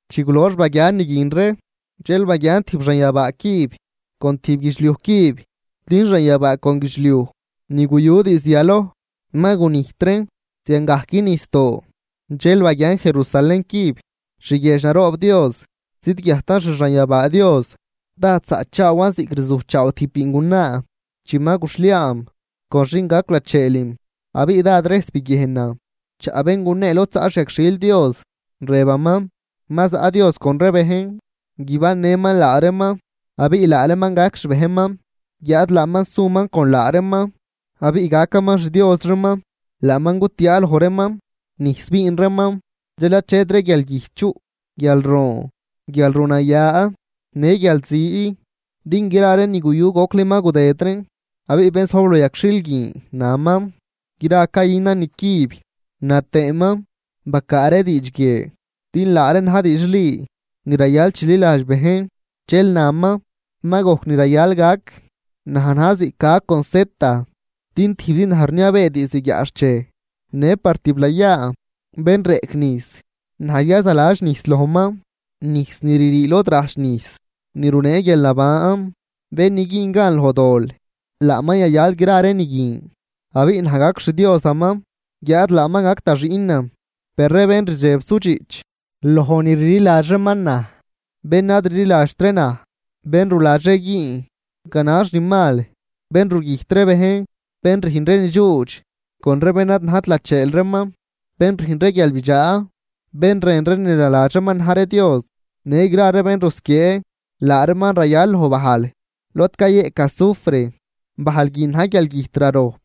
Chi gulox baguian ni guin ree, dxel baguian tijb xanyabaa cüb con tijb guidxliuj cüb, din xanyabaa con guidxliuj ni guyu diizd yaloj ma gunijt reen, ziangajc nijsdoo. Dxel baguian Jerusalén cüb, xguiedx naroob Dios zidguiajtan xi xanyabaa Dios. Dád zaꞌchaawan ziꞌc rzujchaaw tijb biingunaa chi ma guxhliaam con xin gac lacheelim. Abiꞌ dád rejs biguiejnan chaꞌ bén gunee lod zaꞌ xyagxhil Dios, rëbaman: ―Ma zaꞌ Dios con ree bejn, guibannëman laa reeman abiꞌ laa reeman gac xbejnman, guiáad laaman suman con laa reeman abiꞌ gacaman xDios reeman. Laaman gutiaa loj reeman nijs biin reeman, dxel achetri guialgüjt chuꞌ, guialroon, guialrunaya në guialzi, din gra ree ni guyu gocli ma gudëd reen. Abiꞌ bén zojb loj yagxhil guin, naman: ―Gra cayünan nicüb. Na tëëman: ―Bacaa ree diidx guie, din laa reen na̱j diidxli ni rayal chililadx bejn. Dxel naman: ―Ma gojc ni rayal gac. Naj na̱j ziꞌc A con Z, din tijbzi naj rniabee diizd guiaꞌxchej në par tiblayaa. Bén reꞌc nijs, naj yazaladx nijs lojman nijs ni ririi lod rajch nijs ni runee guialnaban. Bén ni güün gan loj dol, laaman yayal gra ree ni guin. Abiꞌ naj gac xDiosaman guiáad laaman gac da xiꞌnan. Per ree bén rdxeb sudxiꞌch loj ni rliladx reeman naj, bén ad rliladxt ree naj, bén ruladx ree güün ganax ni mal, bén rugüjt ree bejn, bén rüjn ree nidxuudx con ree bén ad najt lacheel reeman, bén rüjn ree guialbidxaa, bén rën ree ni naladx reeman na̱j ree Dios, në gra ree bén rusquiee, laa reeman rayal loj bajl lod cayeꞌc azufre, bajl guin na̱j guialgüjt rarojp.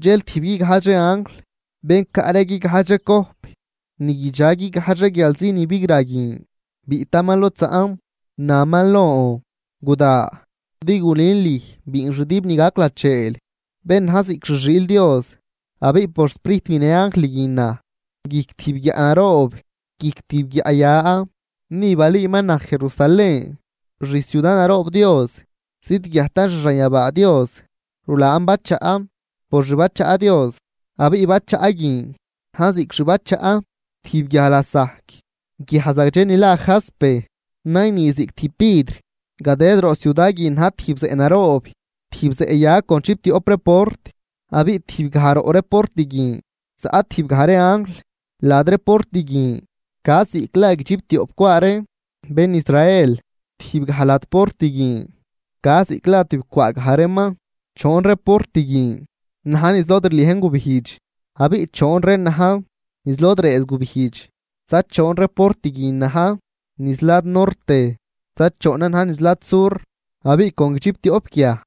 Dxel tijb guigajdx ree anjl bén caꞌ ree guigajdx ree cojp ni guidxa guigajdx ree guialzi bigra guin, biꞌtaman lod zaꞌn, naman lon: ―Guda, din gulün lüj biinxdüb ni gac lacheel bén na̱j ziꞌc xi xiil Dios. Abiꞌ por Sprijt binë anjl guin naj guijc tijb guiaꞌ naroob, guijc tijb guiaꞌ ya. Ni balüüman naj Jerusalén, xciuda naroob Dios zidguiajtan xi xanyabaa Dios. Rulaan bachaꞌ por xbachaꞌ Dios. Abiꞌ bachaꞌ guin na̱j ziꞌc xbachaꞌ tijb guiaj lasajc, guiaj zagdxe ni la Jaspe, nayni ziꞌc tijb vidr. Gadëd roꞌ ciuda guin na̱j tijb zeꞌ naroob, tijb zeꞌ ya con chiptioꞌp ree port, abiꞌ tijb gaj roꞌ ree port guin zaꞌ tijb gaj ree anjl. Lad ree port guin ca ziꞌc la guidxiptioꞌp cwaa ree bén Israel, tijb gaj lad port guin ca ziꞌc la tibcwaa gaj reeman. Choon ree port guin na̱j niz lod rliejn gubijdx, abiꞌ choon reen na̱j niz lod rëëz gubijdx, za choon ree port guin na̱j niz lad norte, za choonan na̱j niz lad sur. Abiꞌ con chiptioꞌp guiaj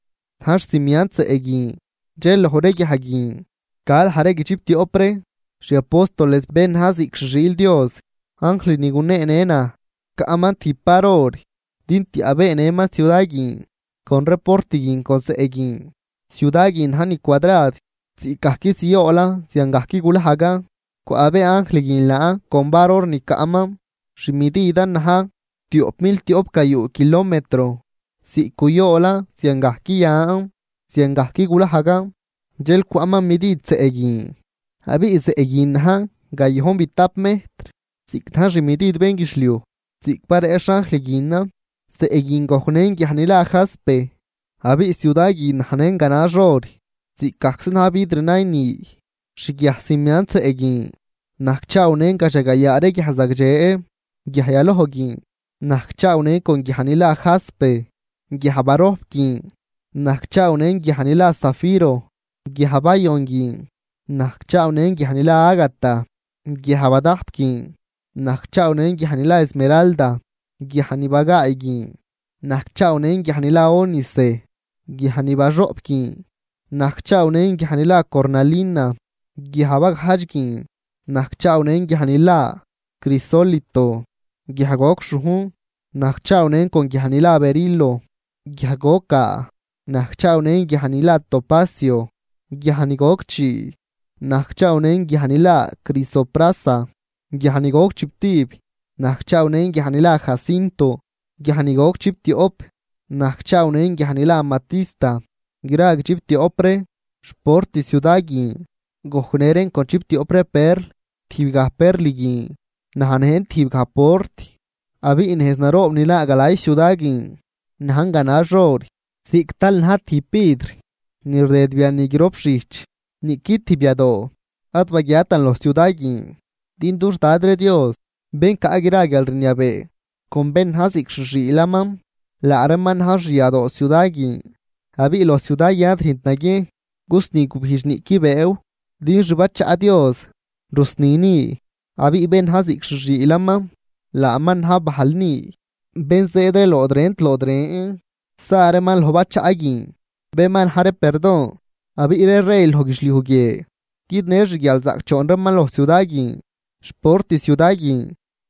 na̱j xcimiant zeꞌ guin, dxel loj ree guiaj guin ca laj ree guidxiptioꞌp ree xi apóstoles bén na̱j ziꞌc xi xiil Dios. Anjl ni guneenë naj caꞌman tijb var or din tiaꞌbeenëman ciuda guin con ree port guin con zeꞌ guin. Ciuda guin najn ni cuadrad, ziꞌcgajc zioolan ziangajc gulajgan. Cwaꞌbee anjl guin laan con var or ni caꞌman, xi mididan na̱j tioꞌp mil tioꞌp gayuu kilometro, ziꞌc guyoolan ziangajc yan, ziangajc gulajgan. Dxel cwaꞌman midid zeꞌ guin, abiꞌ zeꞌ guin najn gayojnbitap mejtr ziꞌc na̱j xmidid bénguidxliuj ziꞌc bareꞌxh anjl guinan. Zeꞌ guin gojcnën guiaj ni la Jaspe, abiꞌ ciuda guin najnën ganax or, ziꞌcgajczi na̱j vidr nayni. Xguiaj cimiant zeꞌ guin najcchaawnën gadxagayaa ree guiaj zagdxe. Guiaj yaloj guin najcchaawnën con guiaj ni la Jaspe, guiaj barojp guin najcchaawnën guiaj ni la zafiro, guiaj bayon guin najcchaawnën guiaj ni la ágata, guiaj badajp guin najcchaawnën guiaj ni la esmeralda, guiaj ni bagaay guin najcchaawnën guiaj ni la ónice, guiaj ni baxoꞌp guin najcchaawnën guiaj ni la cornalina, guiaj bagajdx guin najcchaawnën guiaj ni la crisólito, guiaj goc xhujn najcchaawnën con guiaj ni la berilo, guiaj goc gaa najcchaawnën guiaj ni la topacio, guiaj ni goc chii najcchaawnën guiaj ni la crisoprasa, guiaj ni goc chiptib najcchaawnën guiaj ni la jacinto, guiaj ni goc chiptioꞌp najcchaawnën guiaj ni la amatista. Gra guidxiptioꞌp ree xport ciuda guin gojcnë reen con chiptioꞌp ree perl, tijb gaj perl guin najnë tijbgaj port. Abiꞌ nejz naroob ni naa galay ciuda guin najn ganax or, ziꞌc tal na̱j tijb vidr ni rdëd biani grop xijch. Niꞌqui tijb yadoo ad baguiatan loj ciuda guin din dux Dad ree Dios bén caꞌ gra guialrniabee con bén na̱j ziꞌc xi xiilaman, laa reeman na̱j xyadoo ciuda guin. Abiꞌ loj ciuda guin ad rüjnt naguiejn gusni gubijdx niꞌqui bëëw, din xbachaꞌ Dios rusni ni abiꞌ bén na̱j ziꞌc xi xiilaman laaman na̱j bajl ni. Bén zëëd ree lod rent lod ren sa reeman loj bachaꞌ guin, bén ma na̱j ree perdon. Abiꞌ ree rey loj guidxliuj guie guidnë xguialzaꞌcdxoon reeman loj ciuda guin. Xport ciuda guin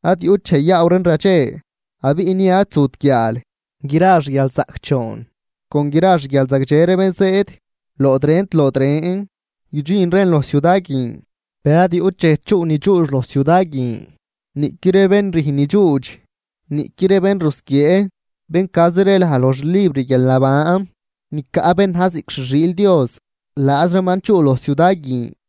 ad yuꞌt dxej yaaw reen radxe, abiꞌ ni ad zut guiaal. Gra xguialzaꞌcdxoon con gra xguialzagdxe ree bén zëëd lood rent lood ren, guidxin reen loj ciuda guin. Per ad yuꞌt dxej chuꞌ ni dxuudx loj ciuda guin, niꞌqui ree bén rüjn ni dxuudx niꞌqui ree bén rusquiee, bén cazi ree laj loj xlibr guialnaban ni caꞌ bén na̱j ziꞌc xi xiil Dios, laaz reeman chuꞌ loj ciuda guin.